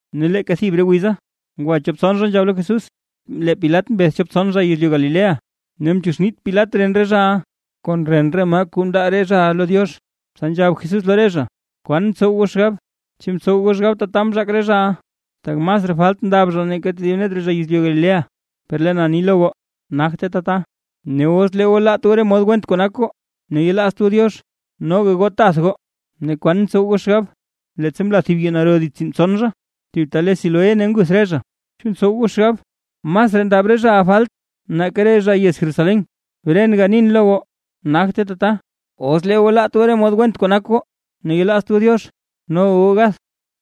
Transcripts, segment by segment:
Ne leeka thib re wiza, ngwa chop tson zha nzhab lo Jesús, lee Pilat mbeth chop tson zha yezlyu Galilea, ne mchuuxnit Pilat ren re zhaʼa kon ren re maa kuu mndaa re zhaʼa lo Diox. Tsa nzhab Jesús lo re zha: ―¿Kwan ntsow goo xgab? ¿Chu ntsow goo xgab tata mzhaak re zhaʼa, tak masraa falt ndab zha nake tedib net re zha yezlyu Galilea? Per lee na ni lo goo, nagte tata; ne os lee goo laat goo re mod went kuu nak goo, ne yelaazt goo Diox, noga goo tath goo. Ne, ¿kwan ntsow goo xgab? Leettsa mla thib yuu naro dits re tsiinbtson zha, thib ta le Siloé ne nguth re zha, ¿chu ntsow goo xgab masraa ndab re zhaʼa falt nake re zha yez Jerusalén? Bren ganin lo goo, nagte tata; os lee goo laat goo re mod went kuu nak goo, ne yelaazt goo Diox, noga goo gath.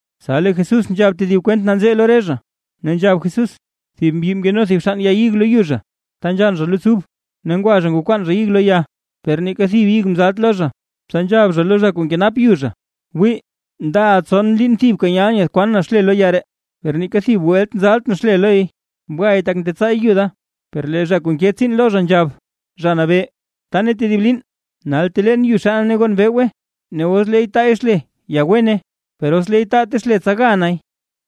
Tsa lee Jesús nzhab tedib kwent nanzee lo re zha, ne nzhab Jesús: ―Thib mbyi mkeno thib xann ya ig lo yu zha ta nzhann zha luts ub. Ne ngwa zha ngwakwaan zha ig lo ya, per neeka thib ig mzalt lo zha. Tsa nzhab zha lo zha kuu nkenap yu zha: “Wii, ndaʼa tson liin thibka nyalʼn nyaadkwaan na xle lo ya ree, per neeka thib welt nzaltʼn xle lo ya. Bgay tak ntetsaay yu da.” Per lee zha kuu nke tsiin lo zha, nzhab: “Zha Nabee, btaane tedib liin, nal teleen yu xanne ne gon bewgwe, ne os leey taay xle ya wene, per os leey taate xle tsa ga nay”.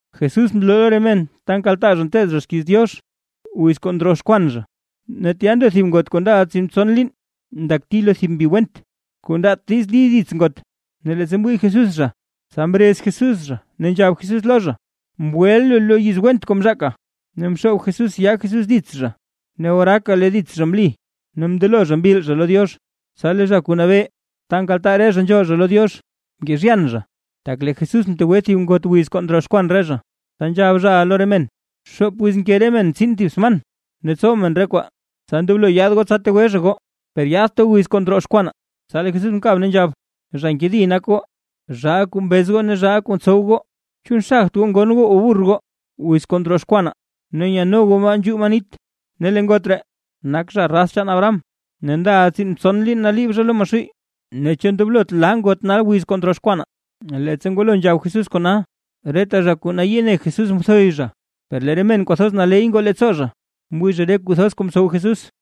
Jesús mloo lo re men ta nkaltaa zha nteed zha xkiiz Diox wiz kuu ndroxkwan zha. Ne tya ndo thib ngot kuu ndaʼa tsiinbtson liin ndakti lo thib mbi went, kuu ndaat diiz li dits ngot. Ne leettsa mwii Jesús zha, tsa mrez Jesús zha, ne nzhab Jesús lo zha: ―Mgweʼa lu lo yiz went kuu mzhaaka. Ne mxoob Jesús yaa Jesús dits zha, ne oraaka lee dits zha mli, ne mndelo zha mbil zha lo Diox. Tsa lee zha kuu nabee ta nkaltaa re zha nzhool zha lo Diox, mkezhyan zha, tak lee Jesús mtegwe thib ngot wiz kuu ndroxkwan re zha, tsa nzhab zhaʼa lo re men: ―Xoop wiz nke men tsin thib sman ne tsow men re kwaa, tsa ndoblo goo yaad goo tsa tegwe zha goo. Per yaadt goo wiz kuu ndroxkwanaa. Tsa lee Jesús mkab ne nzhab: ―¡Zha nkedi nak goo, zhaa kuu mbez goo ne zhaa kuu ntsow goo! ¿Chu nxagt goo ngon goo o burr goo, wiz kuu ndroxkwanaa, ne nyano goo maa nzhuu maa nit? Ne lee ngot ree, nak zha raz chaan Abraham, ne ndaʼa tsiinbtson liin naliib zha lo Maxuuy, ne ¿chu ndoblot laa ngot nal wiz kuu ndroxkwanaa? Leettsa ngwalo nzhab Jesús kona, reta zha kuu nayii ne Jesús mthoy zha, per lee re men kwathoz naley ngoo leettsoo mwii re kuu thoz kuu mtsow Jesús.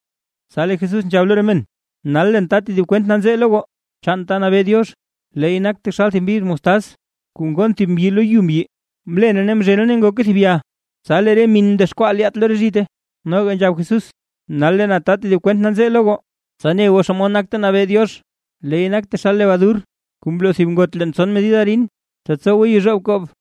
Tsa lee Jesús nzhab lo re men: ―Nal leen ta tedib kwent nanzee lo goo, chaan ta nabee Diox. Leey nak taxal thib mbiz mostaz kuu ngonn thib mbyi lo yu mbyi. Mlene, mzhene ne ngoke thib ya, tsa lee re min mdexkwaa lyaat lo re zhite. Noga nzhab Jesús: ―Nal lee na ta tedib kwent nanzee lo goo, tsa ne goo xomod nak ta nabee Diox. Leey nak taxal lebadur kuu mloo thib ngot leen tson medid arin, tsa tsowe yezhoob koob.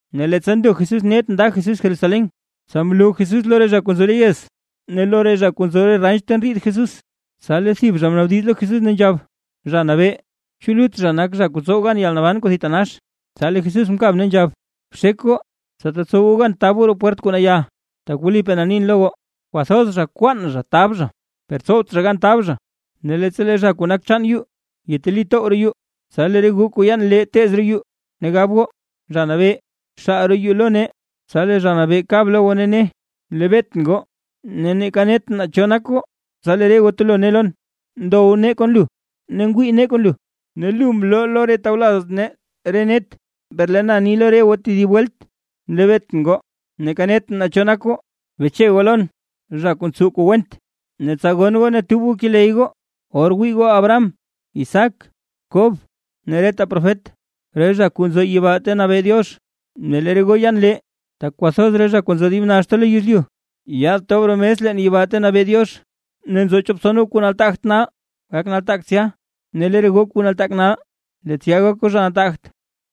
Ne leettsa ndo Jesús net nda Jesús Jerusalén, tsa mloo Jesús lo re zha kuu nzo re yez ne lo re zha kuu nzo re ranch ta ndriid Jesús. Tsa lee thib zha mnaabdiz lo Jesús, ne nzhab: ―Zha Nabee, ¿chu lut zha nak zha kuu tsow gan yalnaban kuu thitanax? Tsa lee Jesús mkab ne nzhab: ―Bxek goo tsa tetsow goo gan tab goo roo pwert kuu naya, tak wlipaa na nin lo goo, kwathoz zha kwaan zha tab zha, per tsowt zha gan tab zha. ’Ne leettsa lee zha kuu nak chaan yuu yeteli tow roo yuu, tsa lee re goo kuu yaan lee teez goo roo yuu, ne gab goo: “Zha Nabee, xaal roo yuu lo nee”. Tsa lee Zha Nabee kab lo goo ne ne: “Nlebeetʼn goo, ne neeka netʼn naa cho nak goo”. Tsa lee re goo telo ne lon: “Ndow nee kon lu ne ngwii nee kon lu, ne lu mloo lo re tawlaz nee re net”. Per lee na ni lo re goo tedib welt: “Nlebeetʼn goo, neeka netʼn naa cho zha goo; beche goo lon, zha kuu ntsow kuu went”. Ne tsa gonn goo ne tub keley goo, or wii goo Abraham, Isaac, Kob ne reta profet, re zha kuu nzo yibaa ta nabee Diox, ne lee re goo yaan lee. Tak kwathoz re zha kuu nzo dib naxta lo yezlyu, yaad tob roo mes leen yibaa ta nabee Diox. Ne nzo chop tson goo kuu nataagt nal, gak nataak tsya; ne lee re goo kuu nataak nal, lee tsya gak goo zha nataagt.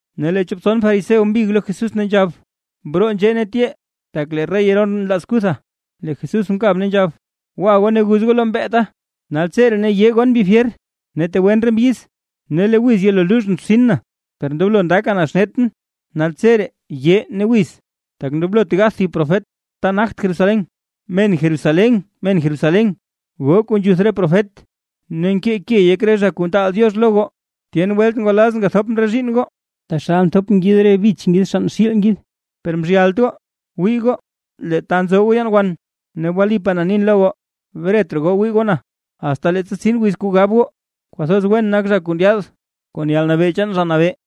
Ne lee chop tson fariseo mbig lo Jesús, ne nzhab: ―Broo nzhee ne tyee, tak lee rey Herodes nlaaz kutha. Lee Jesús mkab ne nzhab: ―Gwa goo ne guz goo lo mbeeta: “Naltseree ne yee gon re mbi fyer, ne tegwen re mbyiz, ne lee wiz yelo luuzhʼn rtsin na”. Per ndoblo ndaka na xnetʼn, naltseree yee ne wiz. Tak ndoblot gath thib profet ta nagt Jerusalén. ’¡Men Jerusalén, men Jerusalén, goo kuu nzhuth re profet ne nkee ke yek re zha kuu ntaal Diox lo goo! ¡Tyen welt ngwalazʼn gathopʼn re zhiinn goo, taxal nthop ngid re bich ngid xann xiil ngid, per mzhyalt goo! Wii goo, lee ta nzo goo yaan wan; ne wlipaa na nin lo goo, bret raa goo wii goo na, asta leettsa tsin wiz kuu gab goo: “¡Kwathoz wen nak zha kuu ndyaad kon yalnabee chaan Zha Nabee!”